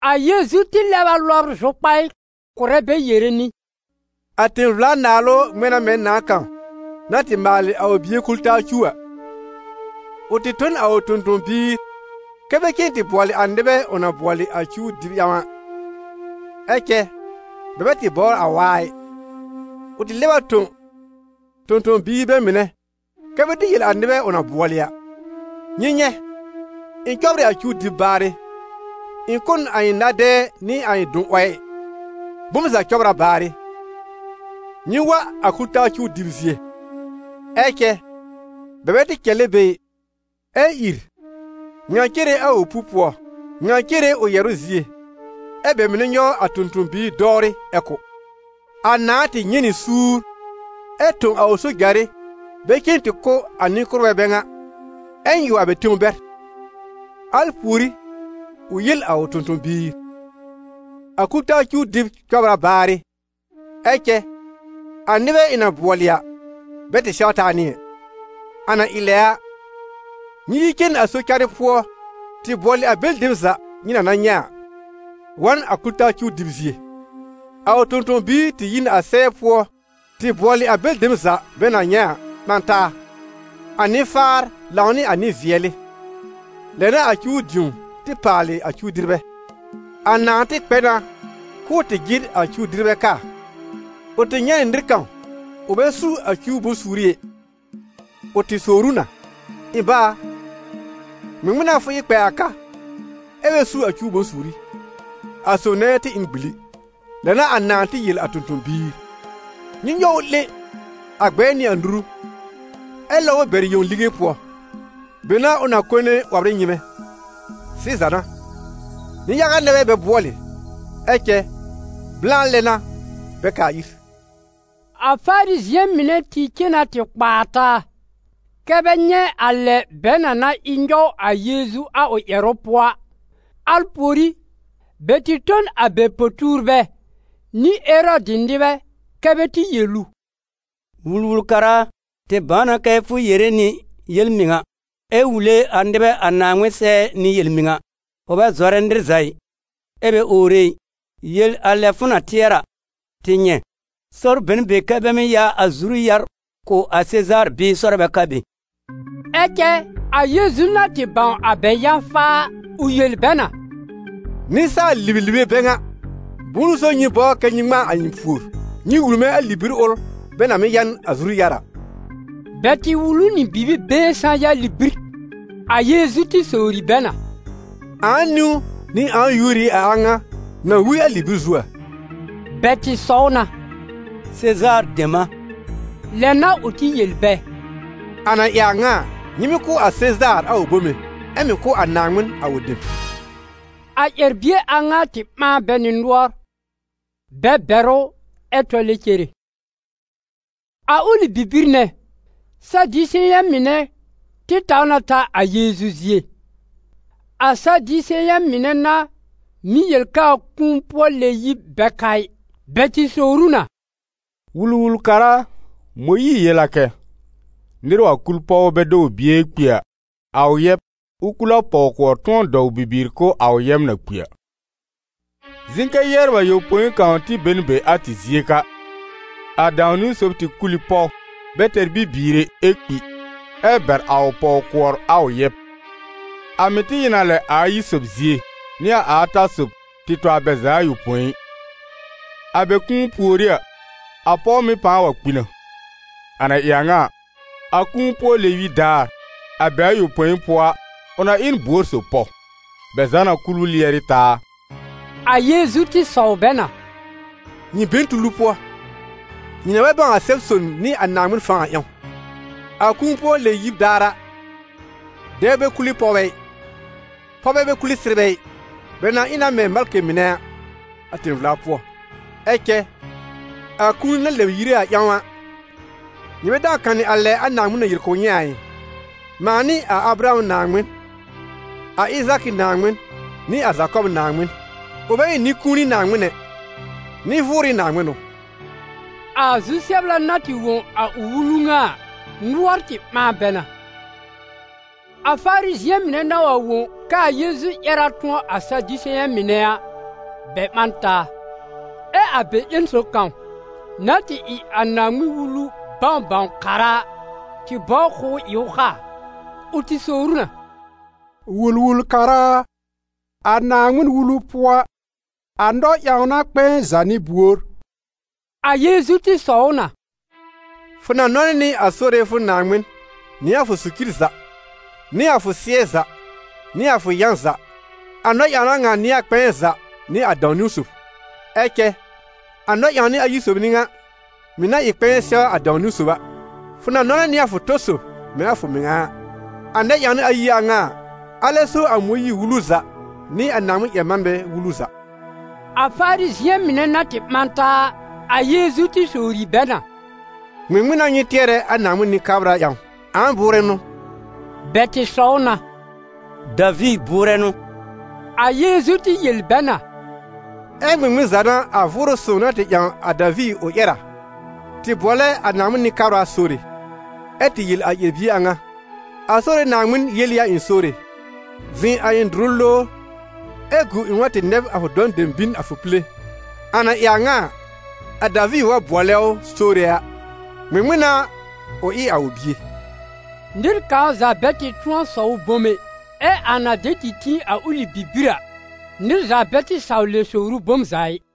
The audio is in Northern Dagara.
A Yeezu tɩ lɛb a lɔbr zʋkpaɩ kʋ̀rɛ bɛ yere nɩ: «A tẽ-vla-naalʋ ŋmɛ̃ na mɛ̃ nãà kãw na tɩ maalɩ a ʋ bie kul-taa cuw a. Ʋ tɩ tõ n a ʋ tõ-tõ-biir kɛ́ bɛ cen tɩ bʋɔlɩ a nɩbɛ ʋ na bʋɔlɩ a cuw dɩb ƴãw. Ɛ cɛ bɛ bɛ tɩ bɔbr a waa ɩ. Ʋ tɩ lɛb a tõ tõ-tõ-biir bɛ mɩnɛ kɛ́ bɛ tɩ yel a nɩbɛ ʋ na bʋɔlɩ a: ‹Nyɩ nyɛ̃, ɩ̃ cɔbr ɩ a cuw dɩb baarɩ, ɩ̃ kʋ́ n a ɩ̃ na-dɛɛ nɩ a ɩ̃ dʋn-'wɔɛ, bom za cɔbr a baarɩ, nyɩ wa a kul-taa cuw dɩb zie.› Ɛ cɛ, bɛ bɛ tɩ cɛlɛ be ɩ, ɛ ìr, ŋa cere a ʋ pu-pʋɔ, ŋa cere ʋ yɛ̀rʋ́ zie, ɛ bɛ mɩnɛ nyɔw a tõ-tõ-biir dɔwrɩ ɛ kʋ́. A nãà tɩ nyɛ̃ nɩ suur, ɛ tõ a ʋ sojarɩ bɛ cen tɩ kʋ́ a nɩ-kʋ́rbɛ bɛ ŋa, ɛ nyɩw a bɛ tẽw bɛr. Al pùorí, ʋ yel a ʋ tõ-tõ-biir: ‹A kul-taa cuw dɩb cɔbr a baarɩ, ɛ cɛ a nɩbɛ ɩ̃ na bʋɔlɩ a, bɛ tɩ sɛw taa nɩ ɛ. A na ɩ lɛ a, nyɩ yi cen a sɔ-carɩ pʋɔ tɩ bʋɔlɩ a bɛlɩ dem za nyɩ na na nyɛ̃ a, wa n a kul-taa cuw dɩb zie.› A ʋ tõ-tõ-biir tɩ yi n a sɛɛ pʋɔ tɩ bʋɔlɩ a bɛlɩ dem za bɛ na nyɛ̃ a ɓã taa, a nɩ-faar lãw nɩ a nɩ-vɩɛlɩ, lɛ n'a a cuw dĩo tɩ paalɩ a cuw-dɩrbɛ. A nãà tɩ kpɛ na k'ʋʋ tɩ jɩr a cuw-dɩrbɛ kaa, ʋ tɩ nyɛ̃ nɩ nɩr kãw ʋ bɛ su a cuw bʋ̃-suuri ɛ. Ʋ tɩ sowr ʋ na: ‹Ɩ̃ bá a, ŋmɩŋmɩn n'a fʋ ɩ kpɛ a ka ɛ bɛ su a cuw bʋ̃-suuri?› A sob nɛ tɩ ɩ n gbili. Lɛ n'a a nãà tɩ yel a tõ-tõ-biir: ‹Nyɩ nyɔw ʋ 'lẽ a gbɛɛ nɩ a nuru, ɛ lɔb ʋ bɛr yẽw lige pʋɔ: be n'a ʋ na kone 'wɔbr ɩ nyɩ́mɛ́.› Sɩza n'a, nɩ-yaga nɛ bɛ bɛ bʋɔlɩ, ɛ cɛ blã lɛ n'a bɛ kaa ir.» A Farizɩ̃ɛ mɩnɛ tɩ cen na tɩ kpaa taa, kɛ́ bɛ nyɛ̃ a lɛ bɛ na na ɩ nyɔw a Yeezu a ʋ ƴɛrʋ pʋɔ a. Al pùorí, bɛ tɩ tõ n a bɛ po-tuurbɛ nɩ Erɔdɩ nɩbɛ kɛ bɛ tɩ yel ʋ: «Wul-wul-kara a, tɩ bãw na kɛ fʋ yere nɩ yel-mɩŋa, ɛ wule a nɩbɛ a Naaŋmɩn sɛɛ nɩ yel-mɩŋa, fʋ bɛ zɔrɛ nɩr za ɩ, ɛ bɛ owre ɩ. Yel a lɛ fʋ na tɩɛrɛ a, tɩ nyɛ̃: sɔr be n be kɛ́ bɛ mɩ́ ya a zuru-yar kʋ̀ a Sezaar bɩɩ sɔr bɛ ka be?» Ɛ cɛ a Yeezu na tɩ bãw a bɛ yã-faa a, ʋ yel bɛ na: «Nɩsaal-libelibe bɛ ŋa! Bʋ̃ʋ n'ʋ so nyɩ bɔr kɛ nyɩ ŋmãa a ɩ̃ pùor? Nyɩ wul mɛ̃ a libir ʋl bɛ na mɩ́ ya n a zuru-yar a.» Bɛ tɩ wul ʋ nɩ bibi-been sã-ya libir. A Yeezu tɩ sowri bɛ na: «Ãa niwn nɩ ãa yúor ɩ a a ŋa na wi a libir zu a?» Bɛ tɩ sɔw na: «Sezaar dem a.» Lɛ n'a ʋ tɩ yel bɛ: «A na ɩ a ŋa a, nyɩ mɩ́ kʋ̀ a Sezaar a ʋ bome, ɛ mɩ̀ kʋ̀ a Naaŋmɩn a ʋ dem.» A ƴɛr-bie a ŋa tɩ ɓãa bɛ nɩ nʋɔr, bɛ bɛr ʋ ɛ tɔlɛ cere. A ʋlɩ bibir nɛ, Sadiseyɛ̃ mɩnɛ tɩ taw na ta a Yeezu zie. A Sadiseyɛ̃ mɩnɛ n'a mɩ́ yel k'aa kũu-pʋɔ-lɛ-yib bɛ ka ɩ. Bɛ tɩ sowr ʋ na: «Wul-wul-kara a, Mõyiir yel a kɛ: ‹Nɩr wa kul pɔw bɛ dɔw bie ɛ kpi a, a ʋ yɛb, ʋ kul a pɔw-kʋɔr tʋ̃ɔ dɔw bibiir kʋ̀ a ʋ yɛb na kpi a.› Zɩ̃ kɛ yɛbr ayopõi kãw tɩ be n be a tɩ zie ka. A dãw-niwn sob tɩ kul ɩ pɔw, bɛ tɛr bibiir ɛ, ɛ kpi, ɛ bɛr a ʋ pɔw-kʋɔr a ʋ yɛb. A mɩ̀ tɩ ɩ n a lɛ a ayi sob zie, nɩ a ata sob, tɩ tɔ a bɛ za ayopõi. A bɛ kũu pùorí a, a pɔw mɩ̀ pãa wa kpi na. A na ɩ a ŋa a, a kũu-pʋɔ-lɛ-yib daar, a bɛ ayopõi pʋɔ a, ʋ na ɩ n buor sob pɔw? Bɛ za na kul ʋ lɩɛrɩ taa a?» A Yeezu tɩ sɔw bɛ na: «Nyɩ be n tulu pʋɔ, nyɩ na bɛ bãw a Sɛb-sõn nɩ a Naaŋmɩn fãw a ƴãw. A kũu-pʋɔ-lɛ-yib daar a, dɛbr bɛ kule pɔwbɛ ɩ, pɔwbɛ bɛ kule sɩrbɛ ɩ, bɛ na ɩ na mɛ̃ malkɩ mɩnɛ a, a tẽ-vla pʋɔ. Ɛ cɛ a kũuni na lɛbr yire a ƴãw a, nyɩ bɛ dãw kanɩ a lɛ a Naaŋmɩn na yel kʋ̀ nyɩ a ɩ? ‹Mãa n'ɩ a Abraham Naaŋmɩn, a Ɩzaakɩ Naaŋmɩn, nɩ a Zakɔb Naaŋmɩn.› Ʋ bɛ ɩ nɩ-kũuni Naaŋmɩn ɛ, nɩ-vʋʋrɩ Naaŋmɩn n'ʋ.» A zu-sɛbla na tɩ wõ a ʋ wulu ŋa a, nʋɔr tɩ ɓãa bɛ na. A Farizɩ̃ɛ mɩnɛ na wa wõ k'aa Yeezu ƴɛr tʋ̃ɔ a Sadiseyɛ̃ mɩnɛ a, bɛ ɓã n taa. Ɛ a bɛ ƴẽn sob kãw, na tɩ ɩ Naaŋmɩn-Wulu bãw-bãw-kara a, tɩ bɔbr k'ʋʋ ɩ ʋ kaa. Ʋ tɩ sowr ʋ na: «Wul-wul-kara a, a Naaŋmɩn-Wulu pʋɔ a, a nɔ-ƴãwna kpɛ̃ɛ za n'ɩ buor?» A Yeezu tɩ sɔw ʋ na: « ‹Fʋ na nɔnɛ nɩ a Sore fʋ Naaŋmɩn nɩ a fʋ socir za, nɩ a fʋ sɩ́ɛ za, nɩ a fʋ yã za.› A nɔ-ƴãwna ŋa n'ɩ a kpɛ̃ɛ za nɩ a dãw-niwn sob. Ɛ cɛ a nɛ-ƴãwnɩ ayi sob ɩ ŋa, mɩ̀ na ɩ kpɛ̃ɛ sɛw a dãw-niwn sob a: ‹Fʋ na nɔnɛ nɩ a fʋ tɔ sob mɛ̃ a fʋ mɩŋa a.› A nɛ-ƴãwnɩ ayi a ŋa a, alɛ so a Mõyiir-Wulu za nɩ a Naaŋmɩn-ƴɛr-manbɛ wulu za.» A Farizɩ̃ɛ mɩnɛ na tɩ ɓã taa a, a Yeezu tɩ sowri bɛ na: «Ŋmɩŋmɩn n'a nyɩ tɩɛrɛ a Naaŋmɩn Nɩ-kabra ƴãw? Ãa bʋʋrɛ n'ʋ?» Bɛ tɩ sɔw na: « Daviir bʋʋrɛ n'ʋ.» A Yeezu tɩ yel bɛ na: «Ɛ ŋmɩŋmɩn za n'a a Vʋʋrʋ Sõw na tɩ ƴãw a Daviir ʋ ƴɛr a, tɩ bʋɔlɛ a Naaŋmɩn Nɩ-kabra: Sore? Ɛ tɩ yel a ƴɛr-bie a ŋa: ‹A Sore Naaŋmɩn yel ɩ a ɩ̃ Sore, zɩ̃ a ɩ̃ dʋrʋ lowr, ɛ gu ɩ̃ wa tɩ nɛb a fʋ dɔ̃ dem bin a fʋ pile?› A na ɩ a ŋa a, a Daviir wa bʋɔlɛ ʋ: Sore a, ŋmɩŋmɩn n'a, ʋ ɩ a ʋ bie?» Nɩr kãw za bɛ tɩ tʋ̃ɔ sɔw ʋ bom ɛ. Ɛ a na dɛ tɩ tĩ a ʋlɩ bibir a, nɩr za bɛ tɩ saw lɛ sowr ʋ bom za ɩ.